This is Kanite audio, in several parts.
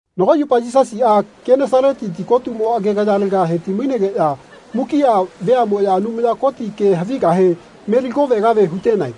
Nago yupa Yisasiꞌa Kenesaleti tikotumo agegayalega hetimainegeꞌya mukiꞌa veaꞌmoꞌya Anumaya Koti ke havigahe meligovegave hutenae.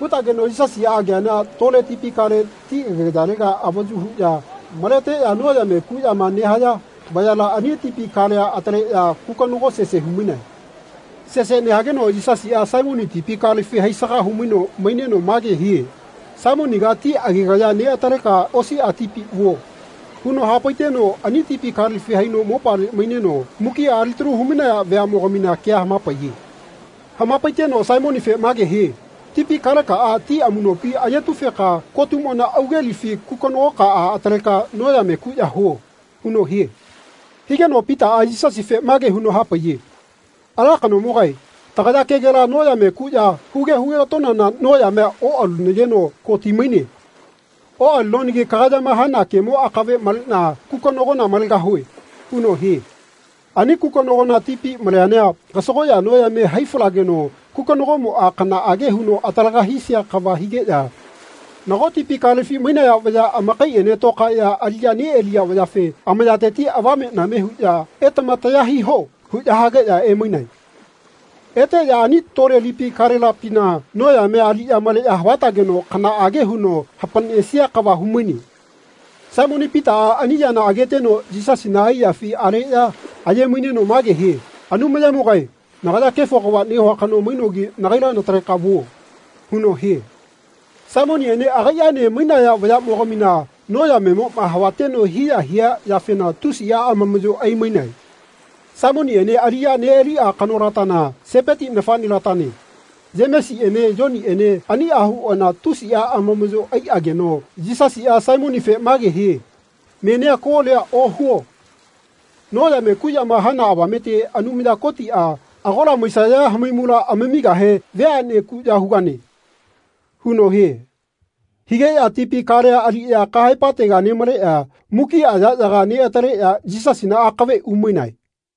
Hutageno Yisasiꞌa ageana tole tipi kale ti agegayalega avayu huꞌya maleteꞌya noyame kuꞌyama nehaya vayala ani tipi kalea ataleꞌya kukonago sese humainae. Sese nehageno Yisasiꞌa Saimoni tipi kalefi haisaga humaino maineno mage hie “Saimoniga ti agegaya neꞌataleka osiꞌa tipi vuo.” huno hapaiteno ani tipi kalefi haino mopale maineno mukiꞌa alitalu humainaya veaꞌmogamina kea hamapaiye. Hamapaiteno Saimonife mage hie “Tipi kalekaꞌa ti amuꞌnopi ayetufeka kotumona augelifi kukonagokaꞌa ataleka noyame kuꞌya huo.” huno hie. Higeno Pitaꞌa Yisasife mage huno hapaiye “Ala kanomogae tagaya kegela noyame kuꞌya huge hugetonana noyamea oꞌalunageno ko timaine. Oꞌalinonagi kagayama hana kemo akave maleꞌna kukonagona malegahue.” huno hie. Ani kukonagona tipi maleana kasagoꞌya noyame hai falegeno kukonagomoꞌa kanaꞌage huno atalaga hisia kava higeꞌya nago tipi kalefi mainaya vaya amakaiꞌene tokaeꞌya aliꞌya neꞌaliya vayafe amayateti avameꞌname huꞌya “Etama taya hiho.” huꞌya hageꞌya emainae. Eteꞌya ani tole lipi kalelatapina noyamea aliꞌya male havatageno kanaꞌage huno hapaꞌnesia kava humaine. Saimoni Pitaꞌa ani yana ageteno Yisasina aiyafi aleꞌya ayemaineno mage hie “Anumayamogae nagaya kefo kava nehua kano mainogi nagaila nataleka vuo.” huno hie. Saimoniꞌene agaiꞌaene mainaya vayaꞌmogamina noyamemoꞌma havateno hiya hia yafena tusiꞌa amamaꞌyo aimainae. Saimoniꞌene aliꞌya neꞌaliꞌa kanolatana, Sepeti nafaꞌnelatane, Yemesiꞌene Yoniꞌene aniꞌa huꞌana tusiꞌa anamaꞌyo aiꞌageno Yisasiꞌa Saimonife mage hie “Menia kolia ohuo. Noyame kuꞌyama hana avamete Anumaya Kotiꞌa agola maisaya hamaimula amamigahe veaꞌne kuꞌya hugane.” huno hie. Higeꞌya tipi kalea aliꞌya kahaepatega nemaleꞌya mukiꞌa yaꞌyaga neꞌataleꞌya Yisasina akave umainae.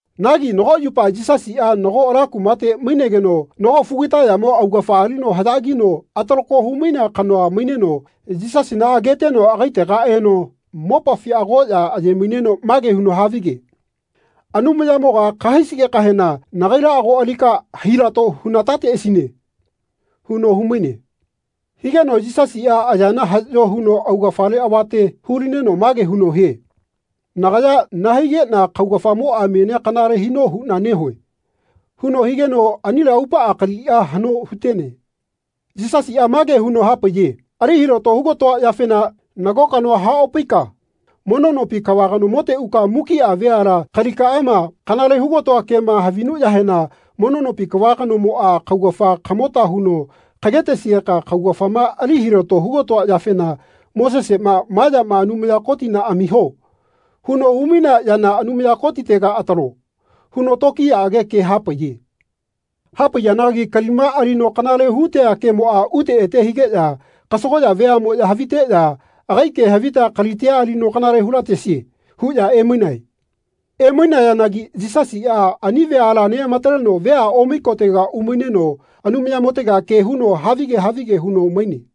Nagi nago yupa Yisasiꞌa nago ala kumate mainegeno nago fugitayamo augafa alino haꞌyagino atalako humainea kanoa maineno Yisasina ageteno agaitega eno mopafi agoꞌya ayemaineno mage huno havige “Anumayamoga kahaisigekahena nagaila ago alika hilato hunatateꞌasine.” huno humaine. Higeno Yisasiꞌa ayana haꞌyo huno augafale avate hulineno mage huno hie “Nagaya nahaigeꞌna kaugafamoꞌa menia kanale hino huꞌna nehue.” huno higeno anile aupaꞌa kaliꞌa haꞌno hutene. Yisasiꞌa mage huno hapaiye “Ali hilato hugatoa yafena nago kanoa haꞌopaika mono nopi kava kanomote uka mukiꞌa veala kalikaꞌama kanale hugatoa kema havinuꞌyahena mono nopi kava kanomoꞌa kaugafa kamota huno kagetesigeka kaugafama ali hilato hugatoa yafena Moseseꞌma ‘Ma yama Anumaya Kotina amio.’ huno humainea yana Anumaya Kotitega atalo.” huno tokiyaꞌage ke hapaiye. Hapaiyanagi kalima alino kanale hutea kemoꞌa ute ete higeꞌya kasagoꞌya veaꞌmoꞌya haviteꞌya “Agai ke havita kalitia alino kanale hulatesie.” huꞌya emainae. Emainayanagi Yisasiꞌa ani veala neꞌamataleno veaꞌne omai kotega umaineno Anumayamotega ke huno havige havige huno maine.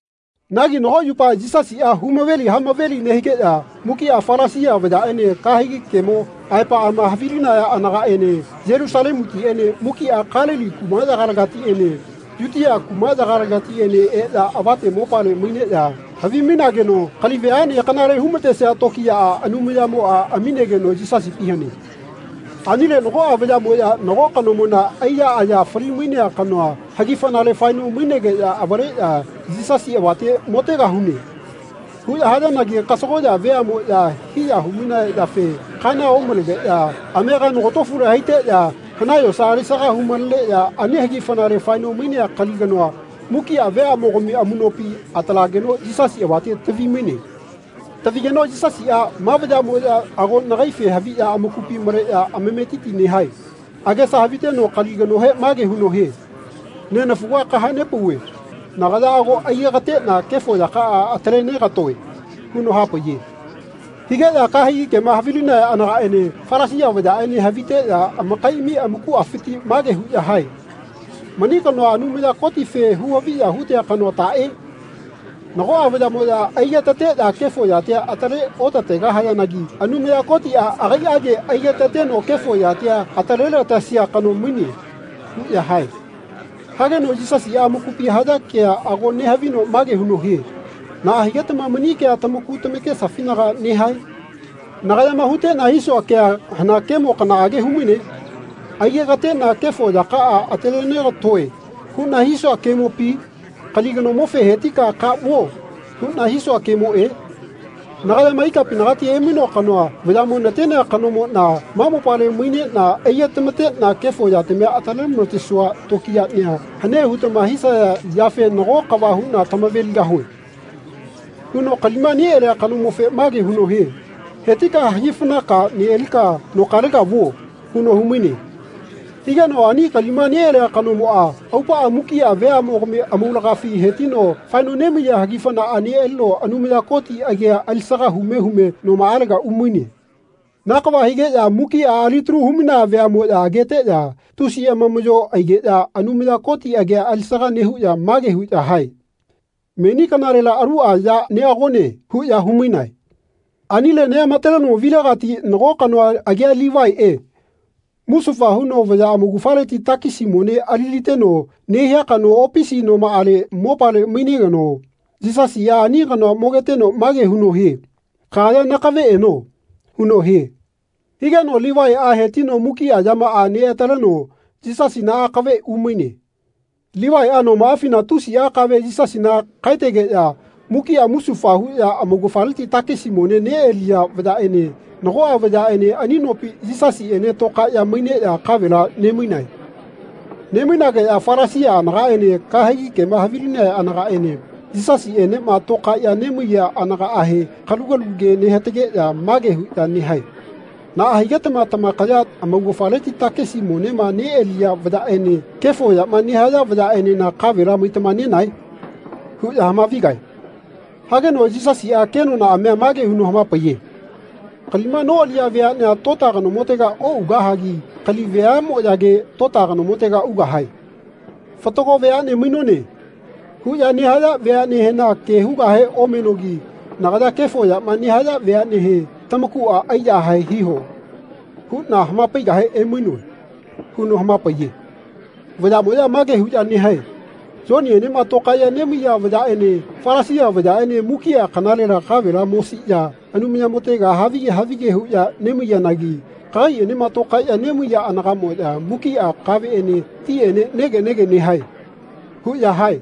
Nagi nago yupa Yisasiꞌa humaveli hamaveli nehigeꞌya mukiꞌa Falasia vayaꞌene kahegi kemo aepaꞌama havilinaya anagaꞌene Yelusalemutiꞌene mukiꞌa Kalili kumaꞌyagaletiꞌene Yutia kumaꞌyagaletiꞌene eꞌya avate mopale maineꞌya havimainageno kali veaꞌne kanale humatesia tokiyaꞌa Anumayamoꞌa amigeno Yisasipi hane. Anile nagoꞌa vayaꞌmoꞌya nago kanomona aiya aya falimainea kanoa hagifanale faeno mainegeꞌya avaleꞌya “Yisasi avate motegahune.” huꞌya hayanagi kasagoꞌya veaꞌmoꞌya hiya humainaya yafe kana omalegeꞌya amega nogatofule haiteꞌya hanae yosa alisaga humaleneꞌya ani hagifanale faeno mainea kali kanoa mukiꞌa veaꞌmogami amuꞌnopi atalageno Yisasi avate tavimaine. Tavigeno Yisasiꞌa “Ma vayaꞌmoꞌya ago nagaife haviꞌya amakupi maleꞌya amametiti nehae.” agesa haviteno kali kanohe mage huno hie “Nenafuga kahanepauve nagaya ago aigekateꞌna kefo yakaꞌa atale negatoe.” huno hapaiye. Higeꞌya kahegi kemo havilinaya anagaꞌene Falasia vayaꞌene haviteꞌya amakaiꞌami amakuꞌafiti mage huꞌya hae “Mani kanoa Anumaya Kotife huhaviya hutea kanoa taꞌe? Nagoꞌa vayaꞌmoꞌya aigetateꞌya kefo yatia atale otategahayanagi Anumaya Kotiꞌa agaiꞌage aigetateno kefo yatia atalelatesia kano maine.” huꞌya hae. Hageno Yisasiꞌa amakupi haya kea ago nehavino mage huno hie “Naꞌa higetama mani kea tamaku tamakesafinaga nehae? Nagayama huteꞌna hisua kea hana kemo kanaꞌage humaine? ‘Aigekateꞌna kefo yakaꞌa atalenegatoe.’ huꞌna hisua kemopi? Kali kanomofe ‘Hetika ka vuo.’ huꞌna hisua kemoꞌe? Nagayama ikapinagati emainoa kanoa vayaꞌmo natenea kanomoꞌna ma mopale maineꞌna aigetamateꞌna kefo yatamia atalelamatesua tokiyaꞌnia hane hutama havisaya yafe nago kava huꞌna tamaveligahue.” huno kalima neꞌalia kanomofe mage huno hie “Hetika hagifanaka neꞌalika nokalega vuo.” huno humaine. Higeno ani kalima neꞌalia kanomoꞌa aupaꞌa mukiꞌa veaꞌmogami amaulagafi hetino faeno nemaiya hagifanaꞌa neꞌalino Anumaya Koti agia alisaga hume hume nomaꞌalega umaine. Na kava higeꞌya mukiꞌa alitalu humainaya veaꞌmoꞌya ageteꞌya tusi amamaꞌyo aigeꞌya Anumaya Koti agia alisaga nehuꞌya mage huꞌya hae “Meni kanalela aluꞌa ya neꞌagone.” huꞌya humainae. Anile neꞌamataleno vilegati nago kanoa agia Livaiꞌe musufa huno vaya amaugafaleti takisi mone aliliteno nehia kanoa opisi nomaꞌale mopale mainegeno Yisasiꞌa ani kanoa mogeteno mage huno hie “Kagaya nakave eno.” huno hie. Higeno Livaiꞌa hetino mukiꞌa yamaꞌa neꞌataleno Yisasina akave umaine. Livaiꞌa nomaꞌafina tusiꞌa kave Yisasina kaetegeꞌya mukiꞌa musufa huꞌya amaugafaleti takisi mone neꞌaliya vayaꞌene nagoꞌa vayaꞌene ani nopi Yisasiꞌene tokaeꞌya maineꞌya kavela nemainae. Nemainageꞌya Falasia anagaꞌene kahegi kemo havilinaya anagaꞌene Yisasiꞌenema tokaeꞌya nemaiya anagahe kalugalu ke nehatageꞌya mage huꞌya nehae “Naꞌa higetama tamakaya amaugafaleti takisi monema neꞌaliya vayaꞌene kefo yama nehaya vayaꞌenena kavela maitama nenae?” huꞌya hamavigae. Hageno Yisasiꞌa kenonaꞌamia mage huno hamapaiye “Kalima noꞌaliya veaꞌnea tota kanomotega oꞌugahagi kali veaꞌmoꞌyage tota kanomotega ugahae. ‘Fatago veaꞌne mainone.’ huꞌya nehaya veaꞌnehena ke hugahe omenogi nagaya kefo yama nehaya veaꞌnehe ‘Tamakuꞌa aiyahae hiho.’ huꞌna hamapaigahe emainoe.” huno hamapaiye. Vayaꞌmoya mage huꞌya nehae “Yoniꞌenema tokaeꞌya nemaiya vayaꞌene Falasia vayaꞌene mukiꞌa kanalela kavela mosiꞌya Anumayamotega havige havige huꞌya nemaiyanagi kagaiꞌenema tokaeꞌya nemaiya anagaꞌmoꞌya mukiꞌa kaveꞌene tiꞌene nege nege nehae.” huꞌya hae.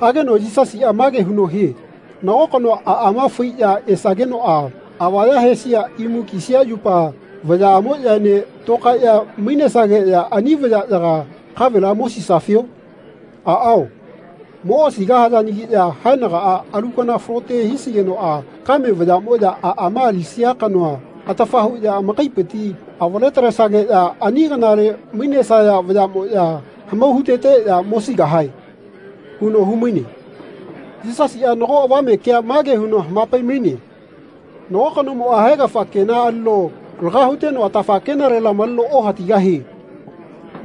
Hageno Yisasiꞌa mage huno hie “Nago kanoa aꞌama faiꞌya esakenoꞌa avaya hesia imu kisia yupa vayaꞌamoꞌyaene toꞌkaeꞌya mainesigeꞌya ani vayaꞌyaga kavela mosisafio? Aꞌao moꞌosigahayanagiꞌya haenagaꞌa alu kana falote hisigenoꞌa kame vayamoꞌya aꞌma alisia kanoa atafa huꞌya amakaipiti avaletalesageꞌya ani kanale mainesaya vayaꞌamoꞌya hamau huteteꞌya mosigahae.” huno humaine. Yisasiꞌa nago avame kea mage huno hamapaimaine “Nago kanomoꞌa haegafa kena alino laga huteno atafa kenalela maleno ohatigahie.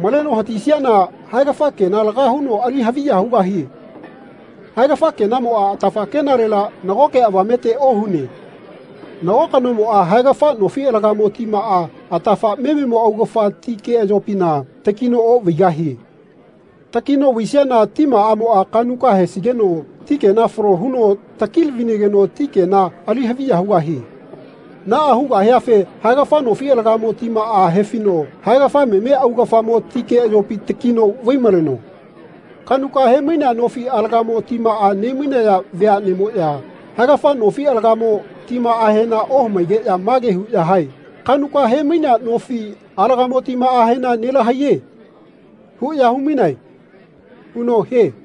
Maleno hatisiana haegafa kena laga huno ali haviya hugahie. Haegafa kenamoꞌa atafa kenalela nagoke avamete ohune. Nago kanomoꞌa haegafa nofi alagamo timaꞌa atafa mememo augafa ti keꞌayopina takino oꞌvaigahie. Takino vaisiana timaꞌamoꞌa kaꞌnuka hesigeno ti kena falo huno takilavinageno ti kena ali haviya hugahie. Naꞌa hugahiafe haegafa nofi alagamo timaꞌa hefino haegafa meme augafamo ti keꞌayopi takino vaimaleno. Kaꞌnuka hemainea nofi alagamo timaꞌa nemainaya veaꞌneꞌmoꞌya haegafa nofi alagamo timaꞌahena ohamaigeꞌya mage huꞌya hae ‘Kaꞌnuka hemainea nofi alagamo timaꞌahena nelahaiye.’ huꞌya humainae.” huno hie.